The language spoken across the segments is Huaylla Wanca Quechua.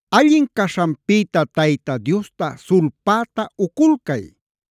Allin caśhanpïta Tayta Diosta sulpäta uculcay.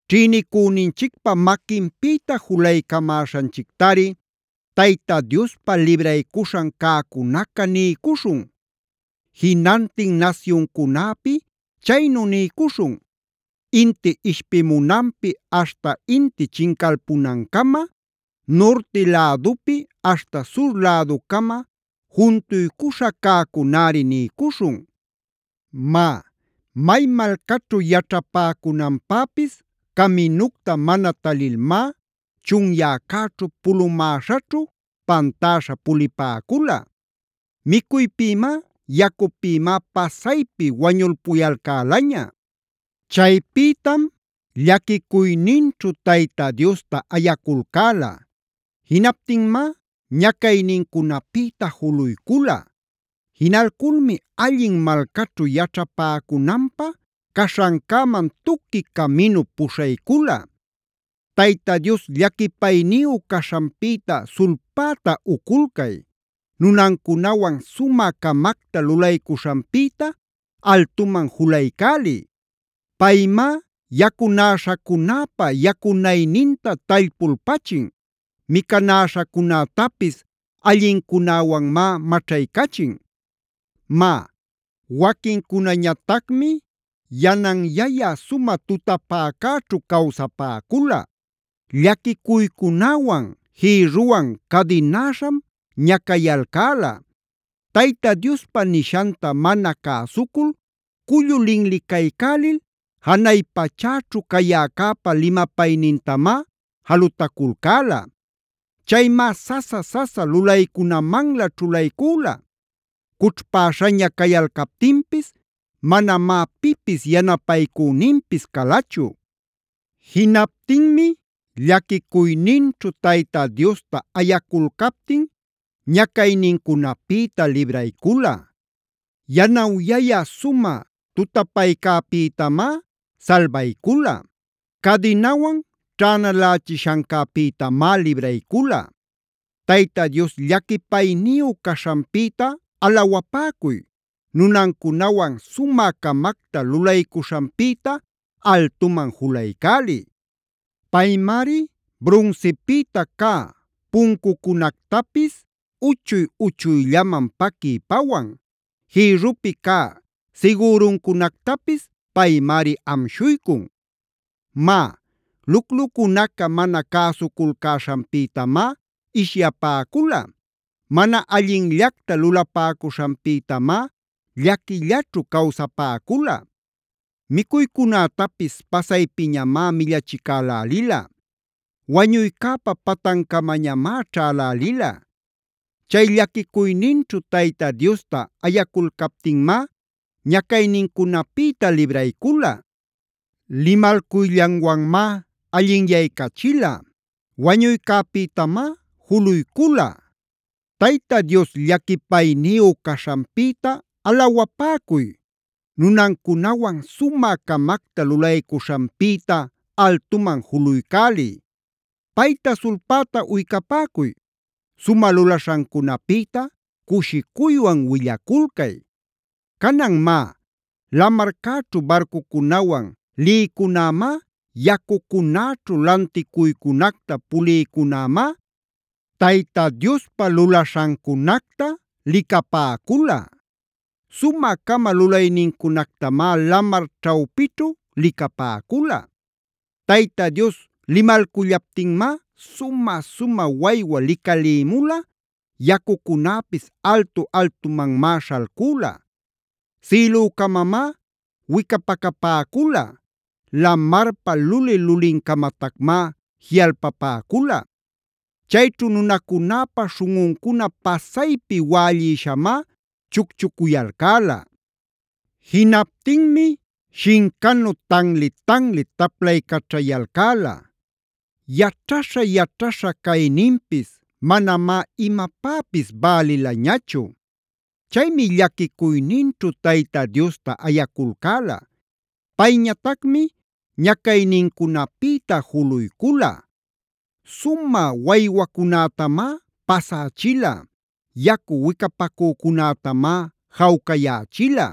Ćhïnicüninchicpa maquinpïta julaycamäśhanchictari Tayta Diospa libraycuśhan cäcunaca niycuśhun. Jinantin nasyuncunäpi chaynu niycuśhun. Inti ishpimunanpi aśhta inti chincalpunancama, nurti lädupi aśhta sur läducama juntuycuśha cäcunäri niycuśhun. Má, may malcaćhu yaćhapäcunanpäpis caminucta mana talilmá chunyäcäćhu pulumäśhaćhu pantäśha pulipäcula. Micuypïmá, yacupïmá pasaypi wañulpuyalcälaña. Chaypïtam llaquicuyninćhu Tayta Diosta ayaculcäla. Jinaptinmá ñacaynincunapïta juluycula. Jinalculmi allin malcaćhu yaćhapäcunanpä caśhancäman tuqui caminup puśhaycula. Tayta Dios llaquipayniyu caśhanpïta sulpäta uculcay. Nunancunawan sumä-camacta lulaycuśhanpïta altuman julaycäliy. Paymá yacunäśhacunäpa yacunayninta tallpulpachin. Micanäśhacunätapis allincunäwanmá maćhaycachin. Má, waquincunañatacmi yananyayä sumä tutapäcäćhu cawsapäcula. Llaquicuycunäwan jïrruwan cadinäśham ñacayalcäla. Tayta Diospa nishanta mana cäsucul cullu linlicaycälil, janay pachäćhu cayäcäpa limapaynintamá jalutaculcäla. Chaymá sasa-sasa lulaycunamanlä ćhulaycüla. Cućhpäśhaña cayalcaptinpis manamá pipis yanapaycüninpis calachu. Jinaptinmi llaquicuyninćhu Tayta Diosta ayaculcaptin ñacaynincunapïta libraycula. Yanawyayä sumä tutapaycäpïtamá salbaycula. Cadinawan ćhänalächishancäpïtamá libraycula. Tayta Dios llaquipayniyu caśhanpïta alawapäcuy. Nunancunawan sumä-camacta lulaycuśhanpïta altuman julaycäliy. Paymari brunsipïta cä puncucunactapis uchuy-uchuyllaman paquiy pawan. Jïrrupi cä sigüruncunactapis paymari amshuycun. Má, luclucunaca mana cäsuculcäśhanpïtamá ishyapäcula. Mana allinllacta lulapäcuśhanpïtamá llaquillaćhu cawsapäcula. Micuycunätapis pasaypiñamá millachicälälila. Wañuycäpa patancamañamá ćhälälila. Chay llaquicuyninćhu Tayta Diosta ayaculcaptinmá ñacaynincunapïta libraycula. Limalcuyllanwanmá allinyaycachila. Wañuycäpïtamá juluycula. Tayta Dios llaquipayniyu caśhanpïta alawapäcuy. Nunancunawan sumä-camacta lulaycuśhanpïta altuman juluycäliy. Payta sulpäta uycapäcuy. Sumä lulaśhancunapïta cushicuywan willaculcay. Canan má, lamarcäćhu barcucunawan lïcunämá, yacucunäćhu lanticuycunacta pulïcunämá, Tayta Diospa lulaśhancunactamá licapäcula. Sumä-cama lulaynincunactamá lamar ćhawpićhu licapäcula. Tayta Dios limalcullaptinmá sumä-sumä waywa licalïmula, yacucunäpis altu-altumanmá śhalcüla. Sïlücamamá wicapacapäcula; lamarpa luli-lulincamatacmá jiꞌalpapäcula. Chayćhu nunacunäpa śhunꞌuncuna pasaypi wällïshamá chucchucuyalcäla. Jinaptinmi shincanu tanli-tanli taplaycaćhayalcäla. Yaćhaśha-yaćhaśha cayninpis manamá imapäpis bälilañachu. Chaymi llaquicuyninćhu Tayta Diosta ayaculcäla. Payñatacmi ñacaynincunapïta juluycula. Sumä waywacunätamá pasächila. Yacu wicapacücunätamá jawcayächila.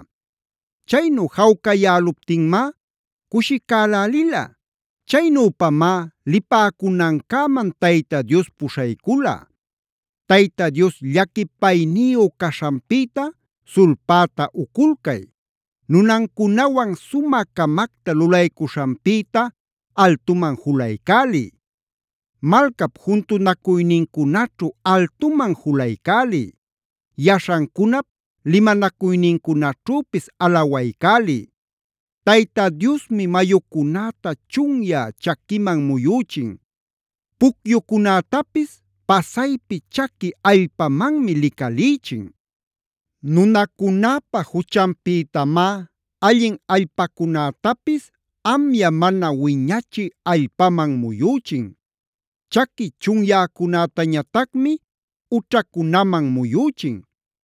Chaynu jawcayäluptinmá cushicälälila. Chaynüpamá lipäcunancäman Tayta Dios puśhaycula. Tayta Dios llaquipayniyu caśhanpïta sulpäta uculcay. Nunancunawan sumä-camacta lulaycuśhanpïta altuman julaycäliy. Malcap juntunacuynincunaćhu altuman julaycäliy. Yaśhancunap limanacuynincunaćhüpis alawaycäliy. Tayta Diosmi mayucunäta chunyä chaquiman muyüchin. Pucyucunätapis pasaypi chaqui allpamanmi licalïchin. Nunacunäpa juchanpïtamá allin allpacunätapis amya mana wiñachï allpaman muyüchin. Chaqui chunyäcunätañatacmi ućhacunaman muyüchin.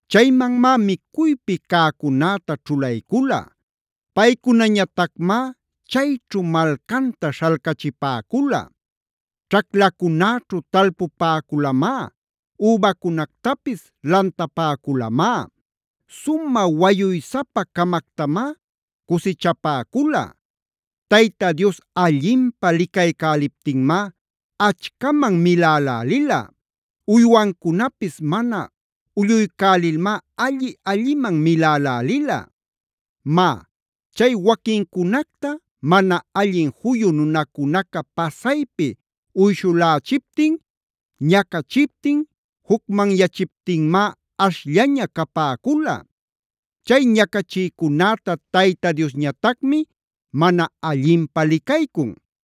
Chaymanmá micuypi cäcunäta ćhulaycula. Paycunañatacmá chayćhu malcanta śhalcachipäcula. Ćhaclacunäćhu talpupäculamá, übacunactapis lantapäculamá. Sumä wayuysapa-camactamá cusichapäcula. Tayta Dios allinpä licaycäliptinmá achcaman milälälila. Uywancunapis mana ulluycälilmá alli-alliman milälälila. Má, chay waquincunacta mana allin juyu nunacunaca pasaypi uyshulächiptin, ñacachiptin, jucmanyachiptinmá ashllaña capäcula. Chay ñacachïcunäta Tayta Diosñatacmi mana allinpä licaycun.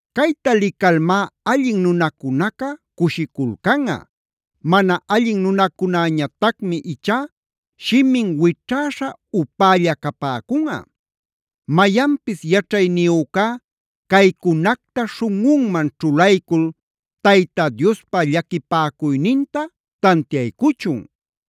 Cayta licalmá allin nunacunaca cushiculcanꞌa. Mana allin nunacunäñatacmi ichá shimin wićhäśha upälla capäcunꞌa. Mayanpis yaćhayniyücá caycunacta śhunꞌunman ćhulaycul Tayta Diospa llaquipäcuyninta tantiaycuchun.